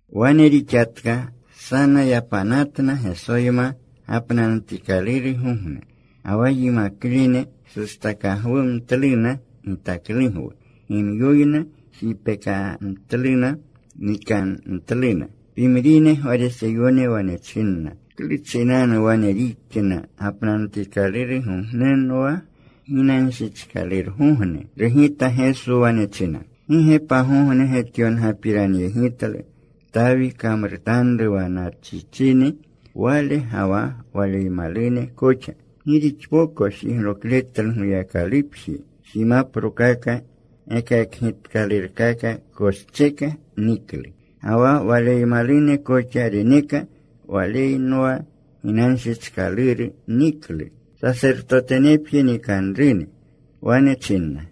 Wane rixatka. Sana yapanatna Gesoyma gapnanutikalurgogne. Ga wa yimaklene sustakagwumtluna gitaklugwu. Gimyoyna jipekamtluna. Nikamtluna. Pimrine Gwariseyone wane china, “¿Klu chinanu wane rixna gapnanutikalurgogne wa ginanshichkalurgogne?” Rugita Geso. Wane chinna, “¿Gi ge pagogne getyongapiranyegitlu Tawi kamrutanru wa nachichini wale ga wa waleymalune koxa? Gi rixpoko jiglokletlu Goyakalupji. Jimaprokaka gekakgitkalurkaka koscheka. Niklu. Ga wa waleymalune koxa reneka. Walenwa ginanshichkaluru niklu. Sasertotenepje nikanruni.” Wane chinna,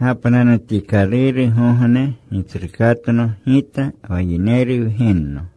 “Gapnanutikalurgogne koxa Gitsrukatno Gita wa Yineru Wgenno.”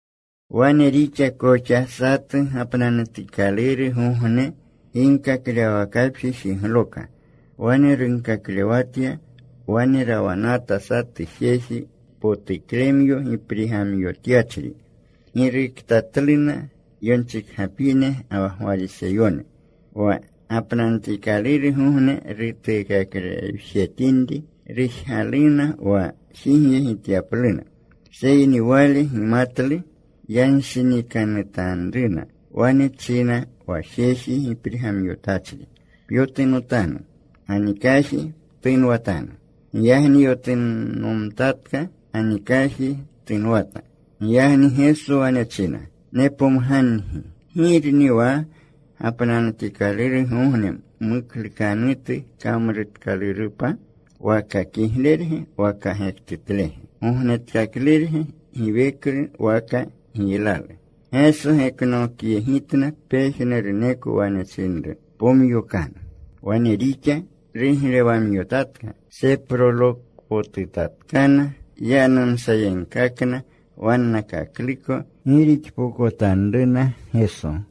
Wane rixa koxa satu gapnanutikalurgogne. Ginkaklewwakapji jigloka. Wane runkaklewatya. Wane rawanata satu jeji potuklemyo giprigamyotyachri. Giruktatluna yonchikgapine ga wa Gwariseyone, wa gapnanutikalurgogne rutuukaklewjetinri. Rujgaluna wa jigyegityapluna. Seyni Wale gimatlu yanshinikanutanruna. Wane chinru wa jeji giprigamyotachri, “Pyotunotanu. Ganikaji ptunwatanu.” Giyagni yotunomtatka. Ganikaji tunwata. Giyagni Geso wane chinna, “Nepomgangi, ¿girni wa gapnanutikalurgogne muklukanutu kamrutkalurupa, waka kiglerge waka gektutlege? ¿Gognetkaklurge giweklu waka giylalu?” Geso geknokyegitna pejnuruneko. Wane chinru, “Pomyokanu.” Wane rixa. Ruglewamyotatka. Seprolokpotutatkana. Yanumsayegkakna wannakakluko gi rixpokotanruna Geso.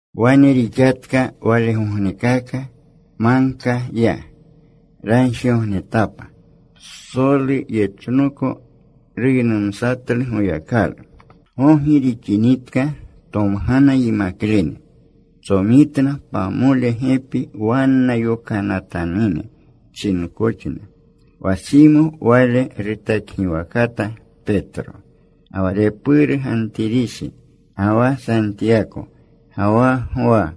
Wane rixatka walegognekaka. Magka ya. Ragjigognetapa. Psolu yechnoko ruynumatlu Goyakalu. Gogi rixinitka, tomgana yimaklene. Tsomitna pamole gepi wanna. Yokanatanune chinkoxna. Wa Simo. Wale rutakgiwakata Petro. Ga wa repuru Gantirishi, ga wa Santiyako, ga wa Gwa,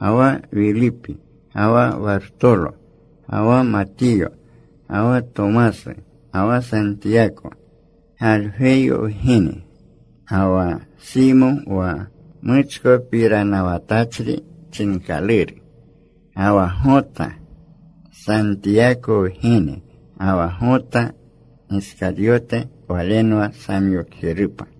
ga wa Wilipi, ga wa Wartolo. Ga wa Matiyo, ga wa Tomasu, ga wa Santiyako, Galgweyo wgene, ga wa Simo wa Muchkopiranawatachri chinkaluru. Ga wa Gota, Santiyako wgene. Ga wa Gota Giskaryote. Walenwa samyokjerupa.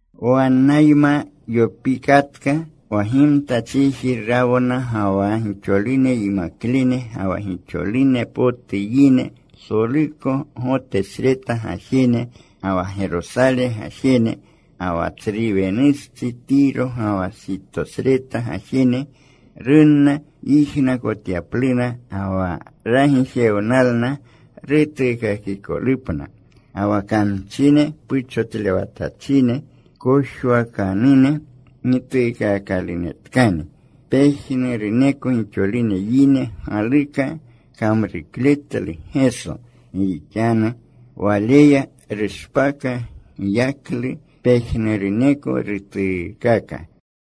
Wannayma yopikatka. Wa gimta chiji rawna ga wa gixolune yimaklene ga wa gixolune potu yine, psoluko Gotesreta gajene, ga wa Gerosale gajene, ga wa tsru wenustsi Tiro ga wa Sitosreta gajene. Runna yijnakotyapluna, ga wa ragijewnalna rutuukakikolupna. Ga wa kamchine puchotlewatachine kojwakanunena gituukaakalunetkani. Pejnuruneko gixolune yine galuka kamrukletlu Geso, gi rixanu Waleya rushpaka giyaklu. Pejnuruneko rutuukaka.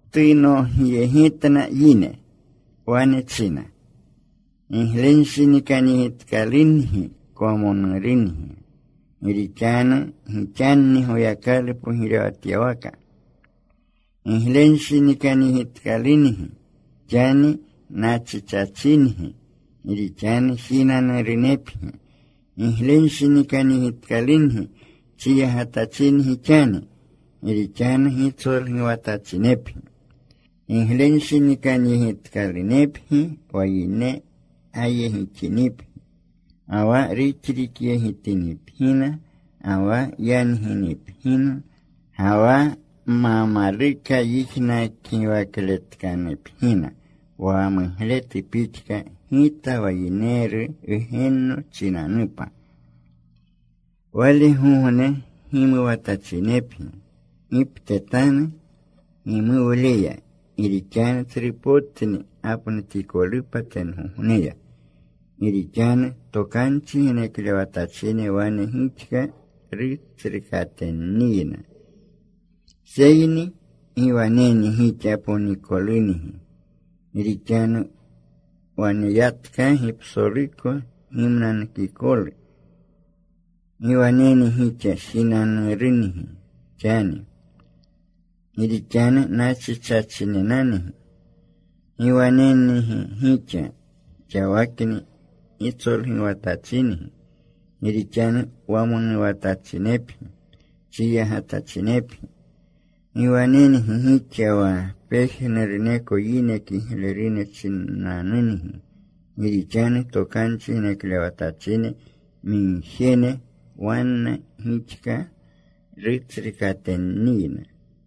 Tunogyegitna yimaklene. Wane china: Giglenshinikanyegitkalungi kwamonurungi, gi rixanu gixanni Goyakalu pogirewatyawaka. Giglenshinikanyegitkalungi xani nachichachingi, gi rixanu jinanurunepgi. Giglenshinikanyegitkalungi chiyagatachingi xani, gi rixanu gitsolguwatachinepgi. “Giglenshinikanyegitkalunepgi wa yine gayegixinipgi, ga wa ruxrikyegitinipgina, ga wa yanginipgina, ga wa ma maluka yijnaklegiwakatinipgina wa mugletu pixka, Gita wa Yineru Wgenno chinanupa. “Walgogne gimuwatachinepgi. Giptetanu gimuwleya. Gi rixanu tsrupotni gapnutikolupa tengogneya. Gi rixanu tokanchi geneklewatachine wane gixka rutsrukatenniyna. Seyni ¡gi wanengi gixa ponikolungi! gi rixanu waneyatkagi psoluko gimnanukikolu. ¡Gi wanengi gixa jinanurungi xani! gi rixanu nachichachinepgi. ¡Gi wanengi gixa xawakni gitsolguwatachingi! gi rixanu wamonuwatachinepgi, chiyagatachinepgi. “¡Gi wanengi gixa wa pejnuruneko yine kiglerune chinanungi! gi rixanu tokanchi geneklewatachine migjene wane gixka rutsrukatenniyna.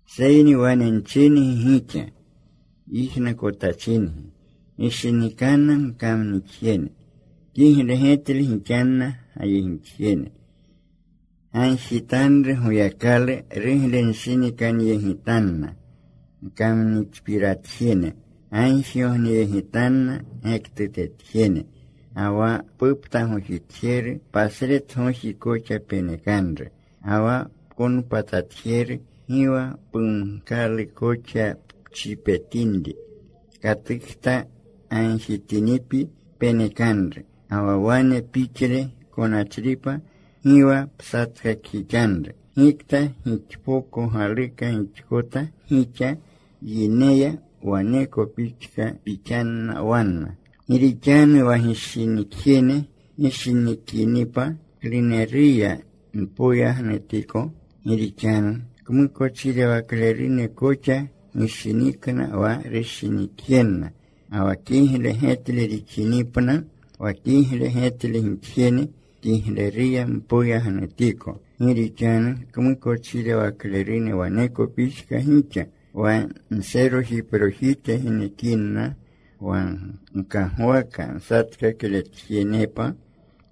“Seyni wane nchingi gixa, yijnakotachingi, gishinikanna gkamnixjene. Kigle getle gixanna gayegixjene. Gagjitanru Goyakalu ruglenshinikanyegitanna gkamakpiratjene. Gagjigogneyegitanna gektutetjene. Ga wa puptagojitjeru pasretgoji koxa penekanru. Ga wa pkonpatatjeru gi wa pumkalu koxa pchipetinri. Katukta gagjitinipyi, penekanru. Ga wa wane pixle konachripa, gi wa psatkakjixanru. Gikta gixpoko galuka gixkota gixa wa yineya, waneko pixka pixanna wanna. “Gi rixanu wa gishinikjene gishinikinipa, ¿kluneruya mpoyagnutiko? Gi rixanu kmukochirewaklerune koxa gishinikna wa rushinikjenna. Ga wa kigle getle gixinipna wa kigle getle gixjene, ¿kluneruya mpoyagnutiko? Gi rixanu kmukochirewaklerune waneko pixka gixa. Wa nserojiprojite genekinna wa gkagwaka nsatkakletjenepa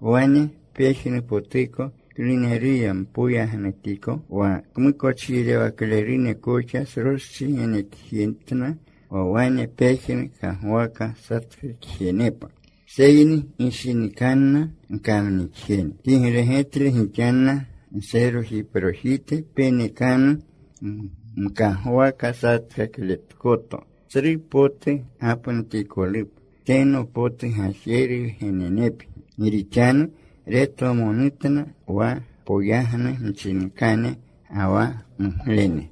wane pejnupotuko, ¿kluneruya mpoyagnutiko? Wa kmukochirewaklerune koxa sroschi genekjetna wa wane pejnu kagwaka satkakjenepa. Seyni gishinikanna gkamnixjene. Kigle getle gixanna. Nserojiprojite genekanu mkagwaka satkakletkoto. Tsru potu gapnutikolupa. Teno potu Gajeru wgenenepgi. Gi rixanu retwamonutna wa poyagnu mchinkane ga wa muglene.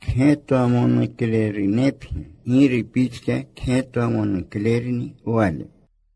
Kgetwamonuklerunepgi, Giru pixka kgetwamonuklerni Wale.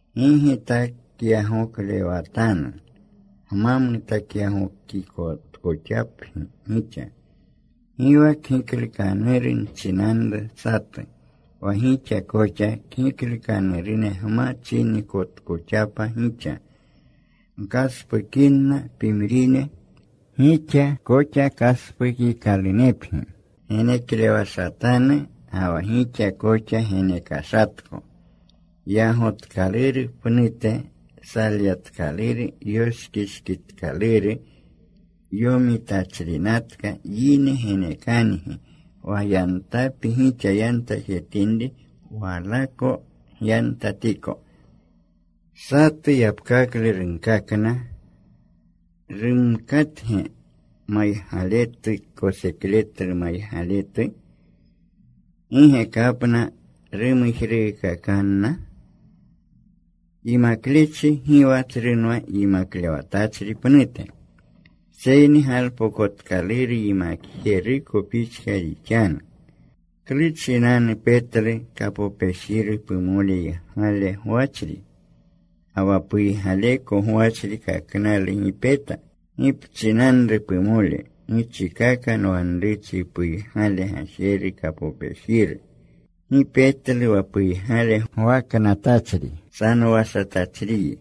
“Gi gitakyagoklewatanu, gma mutakyagokikotkoxapgi gixa. Gi wa kgiklukanuru nchinanru satu, wa gixa koxa kgiklukanurune gma chinikotkoxapa gixa. Gkaspukinna pimrine, gixa koxa kaspukikalunepgi. Geneklewashatanu, ga wa gixa koxa genekashatko. Yagotkaluru pnute, salyatkaluru, yoshkishkitkaluru, yomitachrinatka yine genekangi. Wa yantapi gixa yantajetinri, walako gyantatiko.” Satu yapkaklu runkakna. “¿Rumkatge maygaletu kosekletlu maygaletu? ¿Gi ge kapna rumujruukakanna? Yimaklechi gi wa tsrunwa yimaklewatachri pnute. Seyni galpokotkaluru yimakjeruko pixka rixanu. “¿Klu chinanu petlu kapopejiru pumoleygale gwachri, ga wa puygaleko gwachri kaknalu gi peta? ¿Gi pchinru pumole, ‘Gichikaka. Nwanruchi puygale gajeru kapopejiru’? Gi petlu wa puygale gwaknatachri. Sanowashatachriyi.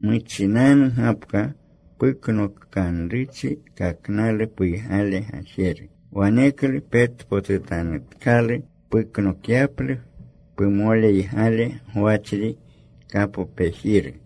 Muchinanu gapka puknokanruchi kaknalu puygale gajeru. Waneklu petpotutanutkalu puknokyaplu pumoleygale gwachri kapopejiru.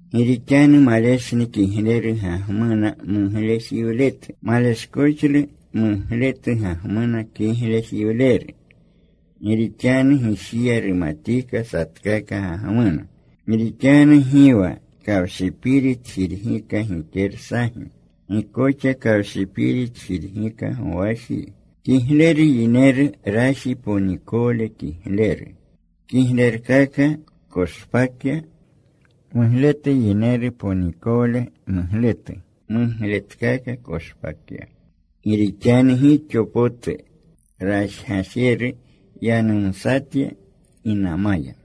“Gi rixanu maleshlu kigleru gagmuna muglejiwletu. Maleshkoxlu mugletu gagmuna kiglejiwleru. Gi rixanu gijiya rumatika satkaka gagmuna. Gi rixanu gi wa kawshipiri tjirgika gikersagi. Gi koxa kawshiri tjirgika gowaji. Kigleru yineru raji ponikowle kigleru, kiglekakalu koshpakya. Mugletu yineru ponikowle mugletu mugletkaka koshpakya. Gi rixanu gixo potu rajgajeru yanumsatya ginamaya.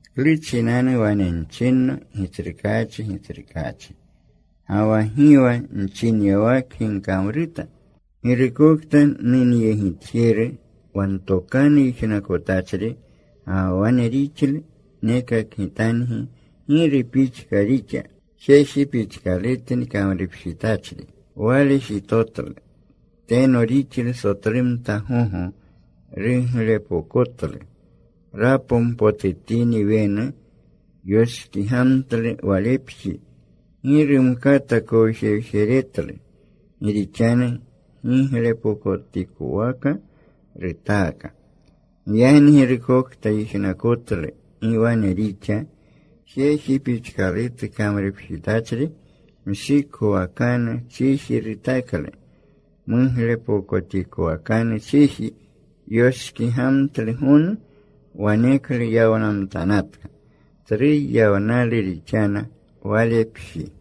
“¿Klu chinanu wane nchinno, ‘Gitsrukaachi, Gitsrukaachi,’ Ga wa gi wa nchinyawakgi gkamruta? Girukokta nunyegitjeru, wa ntokanu yijnakotachri ga wa wane rixlu, nekakgitangi giru pixka rixa. Jeji pixkalutni kamrupjitachri. Wale jitotlu. Teno rixlu. Sotlumta gogo ruglepokotlu. Rapompotutini wenu, yoshkigamtlu walepji. Gi rumkata kowjewjeretlu, gi rixanu giglepokotikwaka rutaaka. Giyagni girukokta yijnakotlu gi wane rixa, jeji pixkalutu kamrupjitachri. Mshikowakanu chiji rutaklu muglepokotikowakanu chiji. Yoshkigamtlu gonu. Waneklu yawnamtanatka. Tsru yawnalu rixana walepji.”